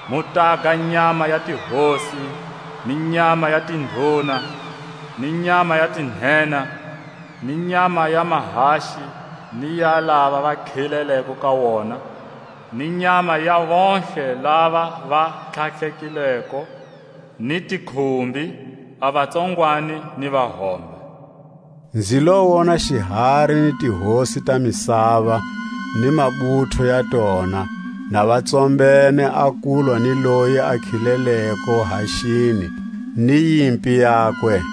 Mu taga a nyama ya tihosi, ni nyama ya tinduna, ni nyama ya tinhenha, ni nyama ya mahaxi ni ya lava va khileleko ka wona, ni nyama ya vontlhe lava va tlhatlhekileko ni tikhumbi, a vatsongwani ni vahombe. Nzi lo wona xihari ni tihosi ta misava, ni mabutho ya tona, na va tsombene a kulwa ni loyi a khileleko haxini ni yimpi yakwe.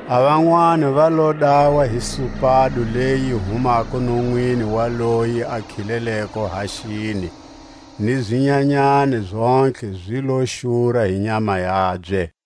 A vanwani va lo dawa hi supado leyi yi humako nonwini wa loyi a khileleko haxini; ni zinyanyani zontlhe zi lo xura hi nyama yabye.